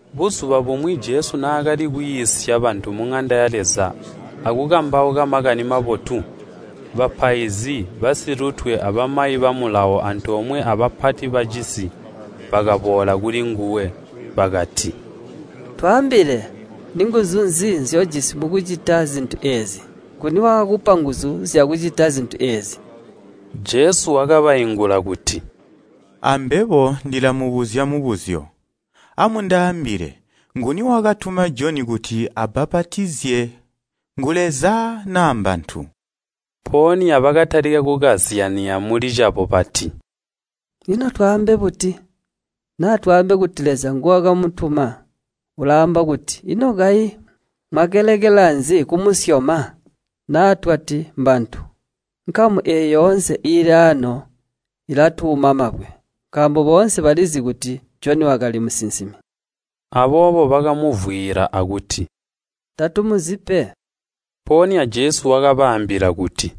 Buzuba bumwi Jesu naakali kwiisya bantu muŋanda ya Leza akukambauka Makani Mabotu, bapaizi basilutwe abamayi ba Mulawo antoomwe abapati bacisi, bakaboola kulinguwe, bakati, “Twaambile, ninguzu nzi nzyojisi mukucita zintu eezi? Nguni waakakupa nguzu zyakucita zintu eezi?” Jesu wakabaingula kuti, “Ambebo ndilamubuzya mubuzyo. Amundaambile, Nguni wakatuma Joni kuti abbapatizye ngu Leza naa mbantu?” Mpoonya bakatalika kukazyanya mulicabo bati, “Ino twaambe buti? Naa twaambe kuti Leza nguwakamutuma, ulaamba kuti, ‘Ino kayi mwakalekela nzi kumusyoma?’ Naa twati, ‘Mbantu’ nkamu eeyi yoonse iili aano ilatuuma mabwe, nkaambo boonse balizi kuti Joni wakali musinsimi.” Aboobo bakamuvwiila akuti, “Tatumuzi pe.” Mpoonya Jesu wakabaambila kuti,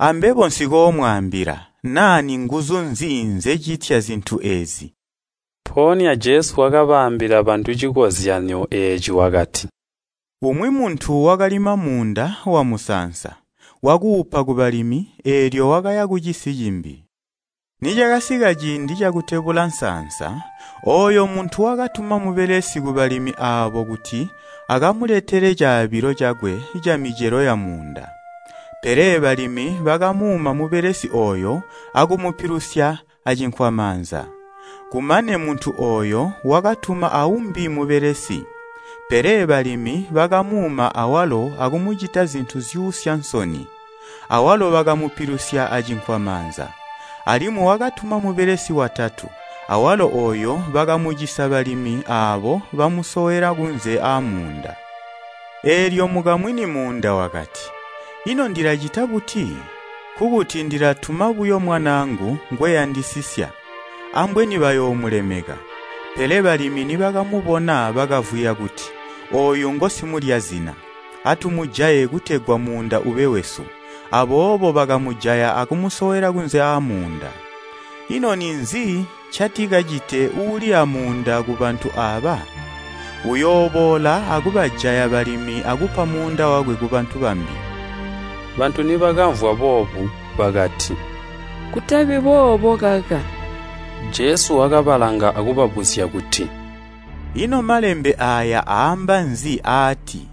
“Ambebo nsikoomwaambila naa ninguzu nzi nzecitya zintu eezi.” Mpoonya Jesu wakaambila bantu cikozyanyo eeci, wakati, “Umwi muntu wakalima muunda wamusaansa. Wakuupa kubalimi, eelyo wakaya kucisi cimbi. Nicakasika ciindi cakutebula nsaansa, ooyo muntu wakatuma mubelesi kubalimi aabo kuti akamuletele caabilo cakwe camicelo yamuunda. Pele balimi bakamuuma mubelesi ooyo akumupilusya acinkwamaanza. Kumane muntu ooyo wakatuma aumbi mubelesi, pele balimi bakamuuma awalo akumucita zintu zyuusya nsoni, awalo bakamupilusya acinkwamaanza. Alimwi wakatuma mubelesi watatu, awalo ooyo bakamucisa balimi aabo bamusowela kunze aamuunda. Eelyo mukamwini muunda wakati, ‘Ino ndilacita buti? Nkokuti ndilatuma buyo mwanaangu ngweyandisisya, ambweni bayoomulemeka!’ Pele balimi nibakamubona bakavwiya kuti, ‘Ooyu ngosimulya zina. Atumujaye kutegwa muunda ube wesu!’ Aboobo bakamujaya akumusowela kunze aamuunda.” Jesu wakababuzya kuti, “Ino ninzi ncatikacite uuli aamuunda kubantu aaba? Uyooboola akubajaya balimi akupa muunda wakwe kubantu bambi.” Bantu nibakamvwa boobu bakati, “Kutabi boobo kaka!” Jesu wakabalanga akubabuzya kuti, “Ino malembe aaya aamba nzi aati,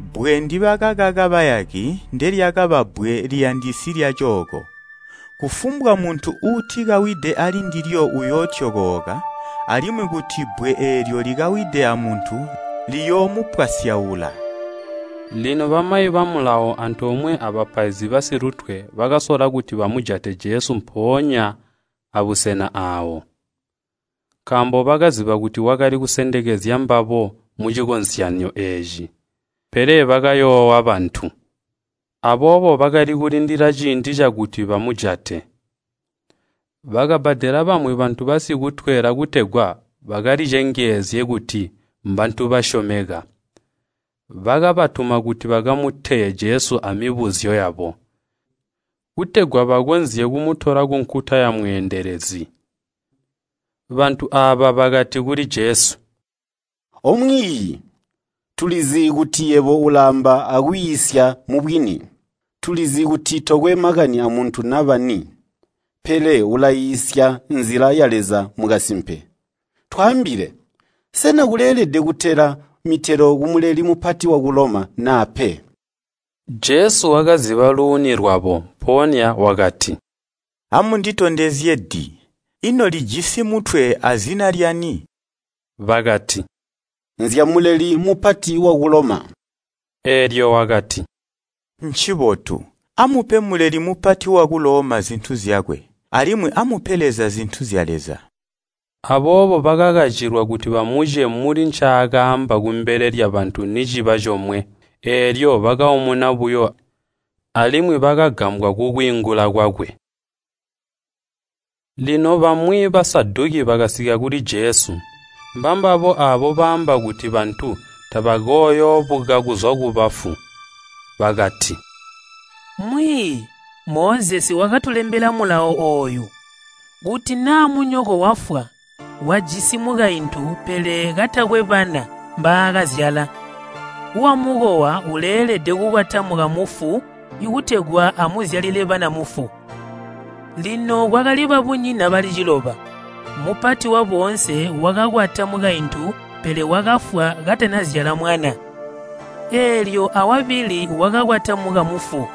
‘Ibbwe ndibakakaka bayaki ndelyakaba bbwe liyandisi lyaacooko.’ Kufumbwa muntu uutikawide alindilyo uyootyokooka, alimwi kuti bbwe eelyo likawide amuntu liyoomupwasyaula.” Lino bamayi ba Mulawo antoomwe abapaizi basilutwe bakasola kuti bamujate Jesu mpoonya abusena aawo, nkaambo bakaziba kuti wakali kusendekezya mbabo mucikozyanyo eeci, pele bakayoowa bantu. Aboobo bakali kulindila ciindi cakuti bamujate. Bakabbadela bamwi bantu basikutwela kutegwa bakalicengezye kuti mbantu basyomeka, bakabatuma kuti bakamuteye Jesu amibuzyo yabo, kutegwa bakonzye kumutola kunkuta yamweendelezi. Bantu aaba bakati kuli Jesu, “O Mwiiyi, tulizi kuti yebo ulaamba akwiisya mubwini. Tulizi kuti tokwe makani amuntu naba ni, pele ulaiisya nzila ya Leza mukasimpe. Twaambile, sena kuleelede kutela mitelo ku Muleli Mupati waku Loma naa pe?” Jesu wakaziba luuni lwabo, mpoonya wakati, “Amunditondezye di. Ino lijisi mutwe azina lyani?” Bakati, “Nzya Muleli Mupati waku Loma.” Eelyo wakati, “Ncibotu, amupe Muleli Mupati waku Loma zintu zyakwe, alimwi amupe Leza zintu zya Leza.” Aboobo bakakacilwa kuti bamuce muli ncaakaamba kumbele lyabantu niciba comwe, eelyo bakaumuna buyo alimwi bakagambwa kukwiingula kwakwe. Lino bamwi Basaduki bakasika kuli Jesu. Mbambabo aabo baamba kuti bantu tabakooyoobuka kuzwa kubafu. Bakati, “Mwiiyi, Mozesi wakatulembela mulawo ooyu, ‘Kuti naa munyoko wafwa wajisi mukaintu pele katakwe bana mbaakazyala, wamukowa uleelede kukwata mukamufu kutegwa amuzyalile bana mufu.’ Lino kwakali babunyina bali ciloba, mupati wa boonse wakakwata mukaintu pele wakafwa katanazyala mwana. Eelyo awabili wakakwata mukamufu,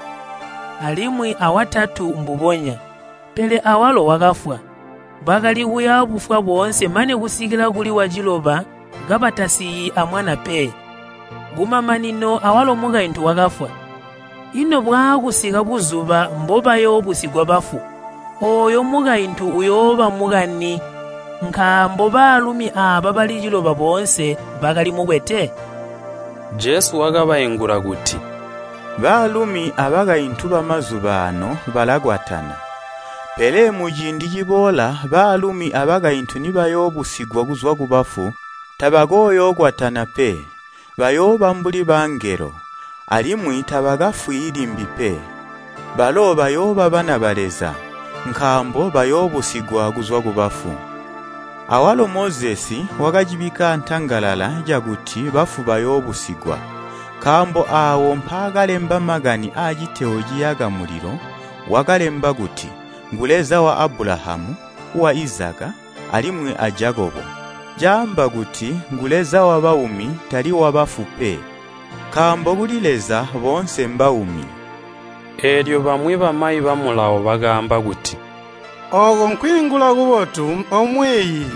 alimwi awatatu mbubonya, pele awalo wakafwa, bakali kuya bufwa boonse mane kusikila kuli waciloba kabatasiyi amwana pe. Kumamanino awalo mukaintu wakafwa. Ino bwaakusika buzuba mbobayoobusigwa bafu, ooyo mukaintu uyooba mukani? Nkaambo baalumi aaba bali ciloba boonse bakali mukwete.” Jesu wakabaingula kuti, “Baalumi abakaintu bamazuba aano balakwatana, pele muciindi ciboola baalumi abakaintu nibayoobusigwa kuzwa kubafu tabakooyookwatana pe. Bayooba mbuli bangelo, alimwi tabakafwi limbi pe. Balo bayooba bana ba Leza, nkaambo bayoobusigwa kuzwa kubafu. Awalo Mozesi wakacibikka aantangalala cakuti bafu bayoobusigwa. Nkaambo aawo mpaakalemba makani aciteyo ciyaka mulilo, wakalemba kuti, ‘Ngu Leza wa Abulahamu, wa Izaka, alimwi a Jakobo!’ Caamba kuti ngu Leza wabaumi, tali wabafu pe, nkaambo kuli Leza boonse mbaumi.” Eelyo bamwi bamayi ba Mulawo bakaamba kuti, “Ooko nkwiingula kubotu, omwiiyi.”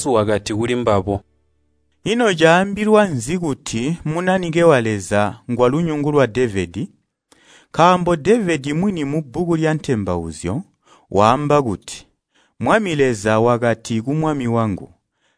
Jesu wakati kulimbabo, “Ino caambilwa nzi kuti Munanike wa Leza ngwalunyungu lwa Devedi? Nkaambo Devedi mwini mubbuku lya Intembauzyo, waamba kuti, ‘Mwami Leza wakati ku Mwami wangu,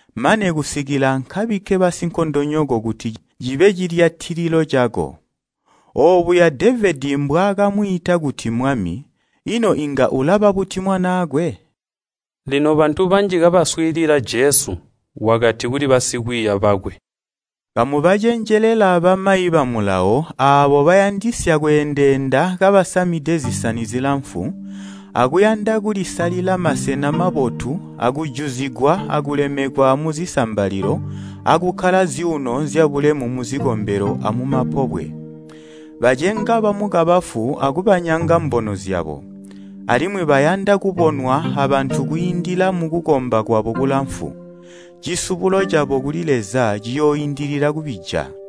Mane kusikila nkabike basinkondonyoko kuti cibe cilyatililo cako.’ Oobuya Devedi mbwaakamwiita kuti ‘Mwami.’ Ino inga ulaba buti mwanaakwe?” Lino bantu banji kabaswiilila Jesu wakati kuli basikwiiya bakwe, “Kamubacenjelela bamayi ba Mulawo aabo bayandisya kweendeenda kabasamide zisani zilamfu, akuyanda kulisalila masena mabotu akujuzigwa akulemekwa muzisambalilo akukkala zyuuno zyabulemu muzikombelo amumapobwe. Bacenga bamukabafu akubanyanga mbono zyabo, alimwi bayanda kubonwa abantu kwiindila mukukomba kwabo kulamfu. Cisubulo cabo kuli Leza ciyooindilila kubija!”